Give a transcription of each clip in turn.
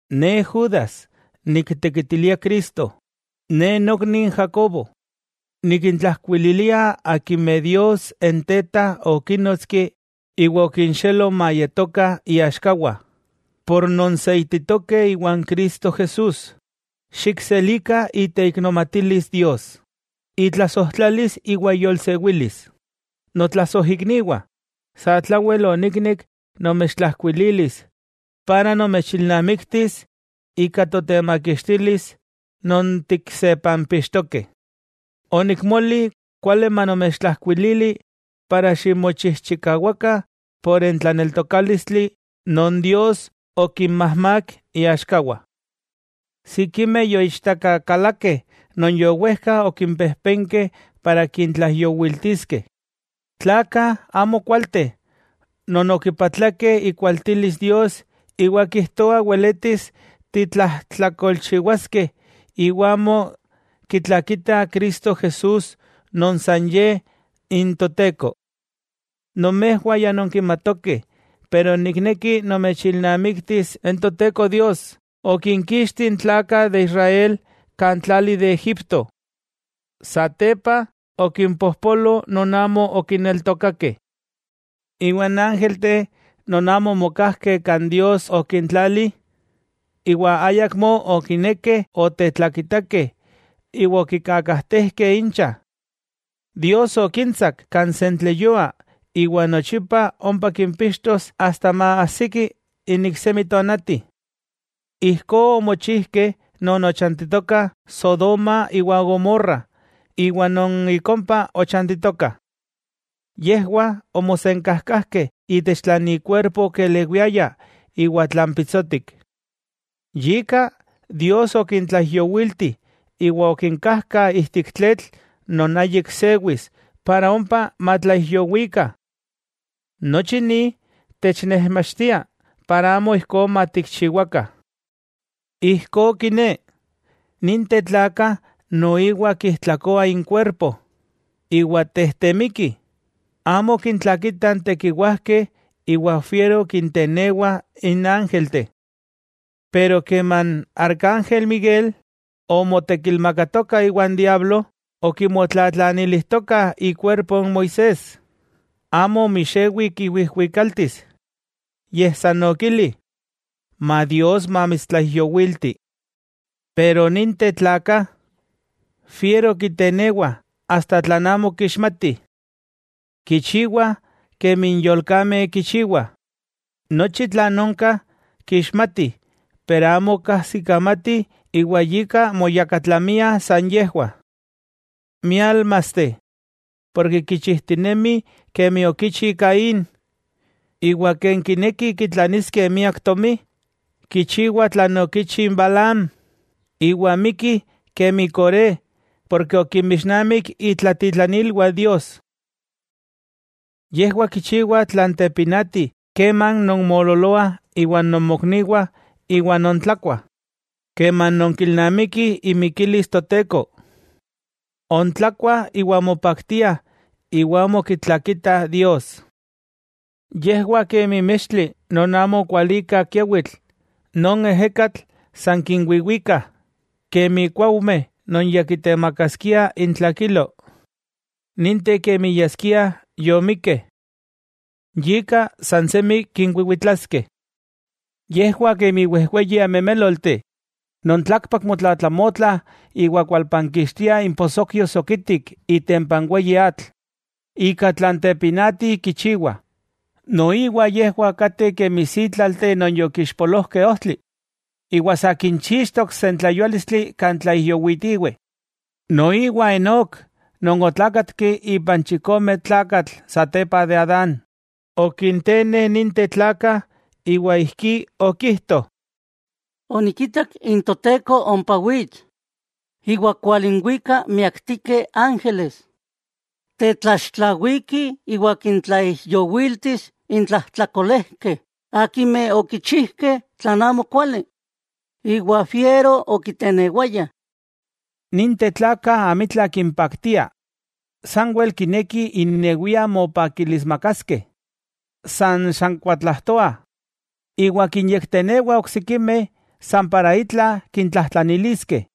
Ne Judas niktekitilia Cristo, ne nokni n Jacobo. Nikintlajkuililia akimeh Dios n Teta okínnotski iwa okinxelo mayetokah iaxkawah, ken nonseititokeh iwan Cristo Jesús. Xikselikah iteiknomatilis Dios, itlasojtlalis iwa iyolsewilis. Notlasojikniwah, satlawel oniknek nomechtlajkuililis iwa nomechilnamiktis ika totemakixtilis non tiksepampixtokeh, onikmoli kuali manomechtlajkuilili para ximochijchikawakah por n tlaneltokálistli non Dios okinmajmak iaxkawah. Sikimeh yoichtakakalakeh non yowejkah okimpejpenkeh para kintlaijyowiltiskeh, tlakah amokualteh non okipatlakeh ikualtilis Dios iwa kijtoah weletis titlajtlakolchiwaskeh iwa amo kitlakitah Cristo Jesús non san Ye n Toteko. Nomejwah ya nonkimatokeh pero nikneki nomechilnamiktis n Toteko Dios okinkixti n tlakah de Israel kan tlali de Egipto. Satepa okimpojpolo non amo okineltokakeh. Iwa n ángelteh non amo omokajkeh kan Dios okintlali, iwa ayakmó okinekeh otetlakitakeh iwa okikakajtejkeh incha. Dios okintsak kan sentleyua iwa nochipa ompa kimpixtos asta maajsiki n iksemi tonati. Ijkó omochijkeh non ochantitokah Sodoma iwa Gomorra iwa non ik ompa ochantitokah. Yejwah omosenkajkajkeh itech tlan inkuerpo okelewiaya iwa tlan pitsotik. Yika Dios okintlaijyowilti iwa okinkajkah ijtik tletl non ayik sewis para ompa matlaijyowikah. Nochi ni technejmachtia para amo ijkó matikchiwakah. Ijkó kiné, ninteh tlakah noiwah kijtlakoah inkuerpo, iwa tejtemikih, amo kintlakitah n tekiwajkeh iwa fiero kintenewah n ángelteh. Pero keman arcángel Miguel, omotekilmakatoka iwan diablo okimotlatlanilijtokah ikuerpo n Moisés, amo omixewi kiwijwikaltis. Yej san okili: “Ma Dios mamitstlaijyowilti.” Pero ninteh tlakah, fiero kitenewa asta tlan amo kixmati. Kichiwa kemi n yolkameh kichiwah, nochi tlan onka kixmatih pero amo kajsikamatih yika moyakatlamiah san yejwah. ¡Miálmasteh! Ken kichijtinemih kemi okichi Caín. Iwa ken kinekih kitlaniskeh miak tomi, kichiwah tlan okichi Balaam, iwa mikkih kemi Coré porke okinmixnamik itlatitlanilwah Dios. Yejwah kichiwah tlan tepinati keman non moololoah iwan nomokniwah iwa nontlakuah, keman nonkilnamikih imikilis Toteko. Ontlakuah iwa mopaktiah iwa amo kitlakitah Dios. Yejwah kemi mextli non amo kualikah kiawitl non n ejekatl san kinwiwikah, kemi kuaujmeh non ya kitemakaskia intlakilo, ninteh kemi yaskiah yomikkeh, yika san semi kinwiwitlaskeh. Yejwah kemi wejweyi amemélolteh non tlakpak motlatlamotlah iwa kualpankixtiah imposokyo sokitik itempa n weyi atl ika tlan tepinati kichiwa. Noiwa yejwah kateh kemi sítlalteh non yokixpolojkeh ojtli, iwa sa kinchixtok n sentleyuálistli kan tlaijyowitiweh. Noiwa Enok non otlákatki ipan chikome tlakatl satepa de Adán, okinteneh ninteh tlakah iwa ijkí okijto: Onikitak n Toteko ompa wits iwa kualinwikah miaktikeh ángeles. Tetlaxtlawikih iwa kintlaijyowiltis n tlajtlakolejkeh akimeh okichijkeh tlan amokuali iwa fiero okitenewayah.” Ninteh tlakah amitla kimpaktia, sanwel kinekih innewiah mopakilismakaskeh, san xankuatlajtoah, iwa kinyektenewah oksikimeh san para itla kintlajtlaniliskeh.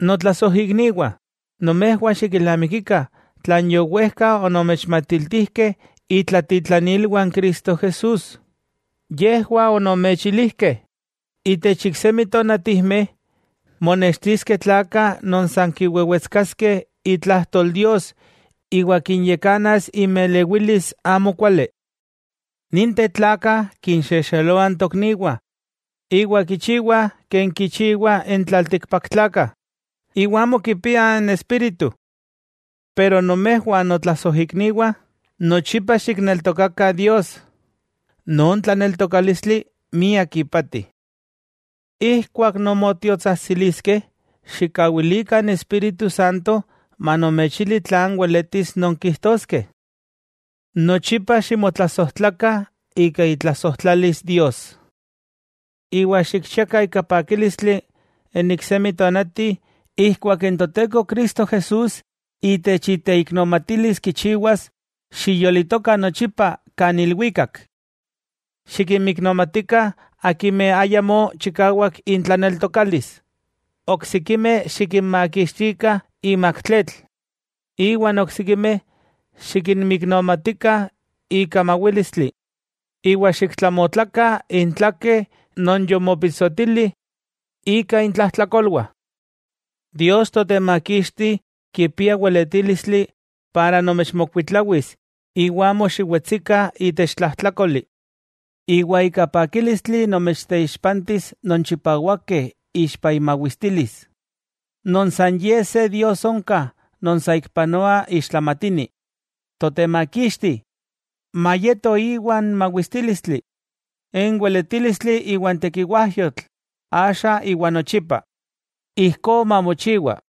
Notlasojikniwah, nomejwah xikilnamikikah tlan yowejka onomechmatiltijkeh itlatitlanilwah n Cristo Jesús. Yejwah onomechilijkeh: “Itech iksemi tonatijmeh, monextiskeh tlakah non san kiwewetskaskeh itlajtol Dios iwa kinyakanas inmelewilis amo kuali.” Ninteh tlakah kinxexeloah n tokniwah iwa kichiwah ken kichiwah n tlaltikpaktlakah, iwa amo kipiah n Espíritu. Pero nomejwah notlasojikniwah, nochipa xikneltokakah Dios. Non tlaneltokálistli miak ipati. Ijkuak nonmotiotsajtsiliskeh xikkawilikah n Espíritu Santo manomechili tlan weletis nonkijtoskeh. Nochipa ximotlasojtlakah ika itlasojtlalis Dios. Iwa xikchiakah ika pakílistli n iksemi tonati ijkuak n Toteko Cristo Jesús itech iteiknomatilis kichiwas xiyolitokah nochipa kan ilwikak. Xikinmiknomatikah akimeh ayamó chikawak intlaneltokális. Oksikimeh xikinmakixtikah imak tletl, iwa n oksikimeh xikinmiknomatikah ika mawílistli, iwa xiktlamotlakah intlakeh non yomopitsotili ika intlajtlakolwah. Dios Totemakixti kipia weletílistli para nomechmokuitlawis iwa amo xiwetsikah itech tlajtlákoli, iwa ika pakílistli nomechteixpantis non chipawakeh ixpa imawistilis, non san Ye se Dios onka non saikpanoa ixtlamatini, Totemakixti, mayeto Íwa n mawistílistli, n weletílistli iwa n tekiwajkayotl axa iwa nochipa. Ijkó mamochiwa.